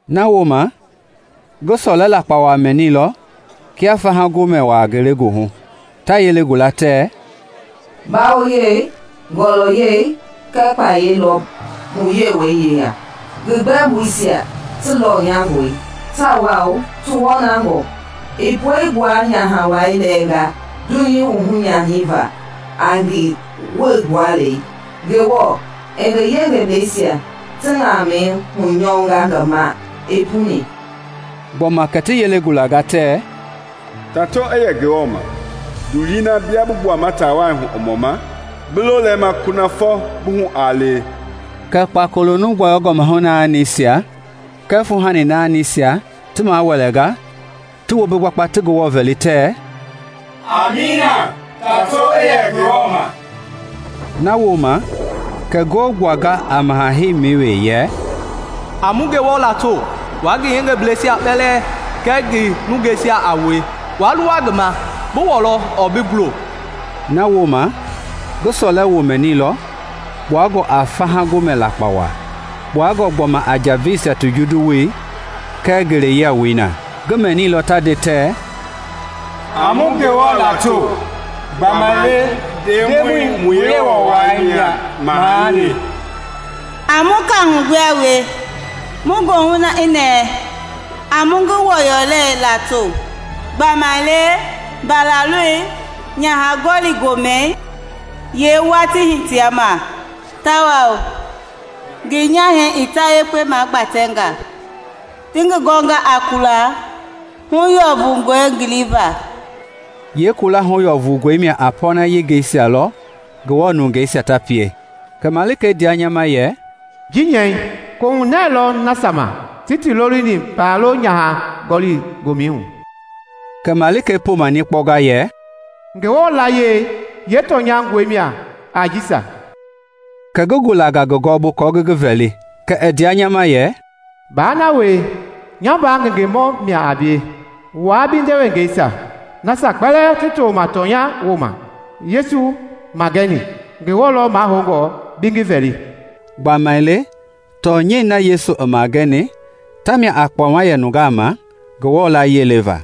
Nawooma ngi sɔlɛ lakpawa mɛnilɔ kia faha gomɛ wa ngelegoohu, ta yele gula, tɛ, “Mbawoyei, ngɔlɔyɛi kɛɛ kpayei lɔ mu Yewɔɛi yeya! Ngi gbɛmboisia ti lɔnyangɔe tawao ti wɔnangɔe! I puegbua nyaha wai lɛɛnga dunyei wuhu nyani va a ngi wuegbualei. Ngewɔ i ngi yengebleisia ti ŋamɛi hunyɔnga ngi ma i puni.” Gbɔma kɛ ti yele gulanga tɛ, “Tato i yɛ Ngewɔ ma! Ndulii na bia bi gbuama taawai hu i mɔma bi lo lɛma kunafɔ bi hu aa lewe.” Kɛ kpakolo nuu gbɔyɔngɔ mahu naanisia kɛɛ fuuhani naanisia ti mawɛlɛnga ti wombi gbakpa ti Ngewɔ vɛli, tɛ, “Amiina! Tato i yɛ Ngewɔ ma!” Nawooma kɛ ngoo gbuanga a maha heimi we yɛ, “A mu Ngewɔ lato, wua ngi yengebleisia kpɛlɛɛ kɛɛ ngi nungeisia a wue wa luwa ngi ma, bi wɔlɔ ɔɔ bi gulo!” Nawooma ngi sɔlɛ wo mɛnilɔ kpuangɔ a faha gomɛ lakpawa, kpuangɔ gbɔma a njaveisia ti junduwoi kɛɛ ngele yiawoi na. Ngi mɛnilɔ ta nde tɛ, “A mu Ngewɔ lato! Gbamaile Ndemɔi mu Yewɔ wai mia Maha le! A mu kahu gbua wie, mu goohu i nɛɛ; a mu ngi wɔlɔyɛi lato! Gbamaile Mbalaloi nyaha gɔli gomɛi yeewatii hitea ma, tawao ngi nyahɛi i tayekpe magbatɛnga. Ti ngi gɔnga a kula huyɔfungɔi ngiliva.” (Yeekula huyɔfungɔi mia a pɔɔna yengeisia lɔ Ngewɔ nungeisia ta pie.) Kɛ malikei ndea nya ma yɛ, “Ji nyɛi: koohunɛɛ lɔ nasia ma ti ti lolini Mbalaloi nyaha gɔli gomɛi hu!” Kɛ malikei poma nikpɔnga yɛ, “Ngewɔ layie yeetɔnyangɔi mia a jisia.” Kɛ ngi gulanga ngi gɔɔbu kɔɔ ngi ngi vɛli, kɛ i ndea nya ma yɛ, “Baa na wie! Nya mbaa ngengemɔ mia a bie, wua bi ndewengeisia, nasia kpɛlɛɛ ti toma tɔnyɛi woma Yesu magɛni. Ngewɔ lɔ mahoungɔ bi ngi vɛli!” Gbamaile tɔnyɛi na Yesu i magɛni, tamia a kpɔma yɛ nungaa ma Ngewɔ layie leva.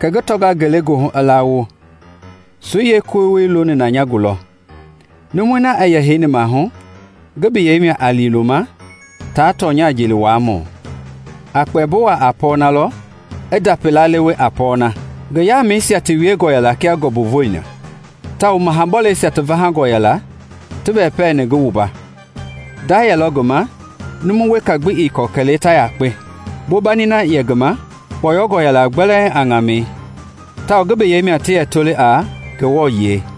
Kɛ ngi tɔnga ngelegoohu i lawo, soi yeekolei looni na nya gulɔ. Numui i yɛ heini maahu ngi biyɛi mia a Liiloma taa tɔnya jeliwuamɔ; a kpɛmbo wuaa a pɔnalɔ i ndapi lalewe a pɔɔna. Ngi yaamɛisia ti wiengɔ yɛla kia ngɔmbu voi na, tawao maha bɔleisia ti vahangɔ yɛla ti wɛpɛɛni ngi wumba. Nda yɛlɔ ngi ma nuu weka gbi ii kɔ kɛlee tayakpe. Bombani na yɛ ngi ma kpɔyɔngɔ yɛla gbɛlɛɛŋ a ŋamɛi tawao ngi biyɛi mia ti yɛ toli a “Ngewɔ Yiɛi.”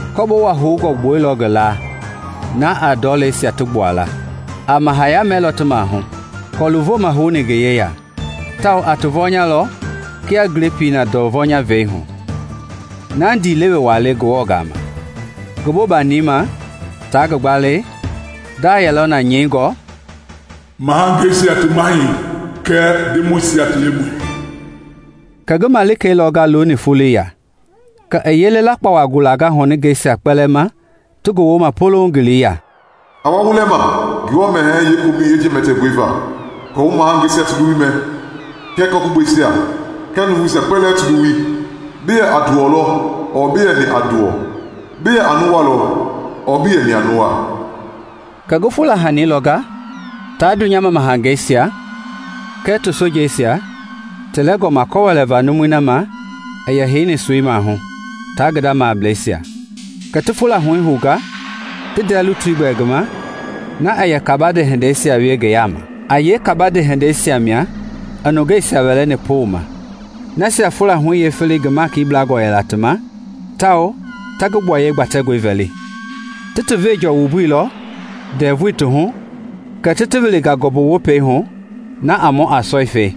Kɔbowa houngɔ i gbuɛilɔ ngi laa na a ndɔleisia ti gbuala. A mahaya mɛlɔ ti maahu kɔlu vomɛi houni ngi yeya, tawao a ti vɔnyalɔ kia glepii na ndɔɔ vɔnya vei hu, na ndiilewe wa le Ngewɔ gama. Ngi bombani ma taa ngi gbalei, nda yɛlɔ na nyɛingɔ, “Mahangeisia ti Mahɛi kɛɛ Ndemɔisia ti Lemɔi.” Kɛ ngi malikei lɔnga looni foloi ya. Kɛ i yele lakpawa gulanga ŋɔningɛisia kpɛlɛɛ ma ti gowoma polouŋ ngele ya, “A wa wu lɛma Ngewɔ mɛhɛɛ yeekomɛ jɛmɛtɛngɔe va; aako wu mahangeisia ti luwui mɛ, kɛɛ kɔ-gugbɛisia, kɛɛ nuuvuisia kpɛlɛɛ ti luwui, bi yɛ a nduwɔ lɔ ɔɔ bii yɛni a nduwɔ, bi ya a nuwa lɔ ɔɔ bii yɛni a nuwa!” Kɛ ngi fula huɛi lɔnga taa dunyama mahangeisia kɛɛ ti sojeisia ti lɛngɔma kɔ wɛlɛva numui ma i heini soi maahu taa ngi nda mableisia. Kɛ ti fula huɛi hounga ti ndɛɛ lutui gbɛli ngi ma na yɛ kabande hindeisia wie ngi yaama. (A yee kabande hindeisia mia i nungeisia wɛlɛni poma, nasia fula huɛi yeefeleyei ngi maiki blangɔ yɛla ti ma tawao ta ngi gbuayei gbatɛngɔi vɛli) Ti ti venjɔ wumbuilɔ ndɛvui ti hu kɛ ti ti wilinga ngɔmbu wopei hu na a mɔ a sɔifɛi.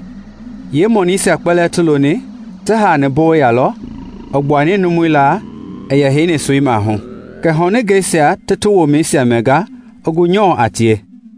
Yee mɔnuisia kpɛlɛɛ ti loni ti haani bowei yalɔ i gbuani numui laa yɛ heini soi maahu, kɛ ŋɔningɛisia ti ti womɛisia mɛnga i gu nyɔɔ a tie.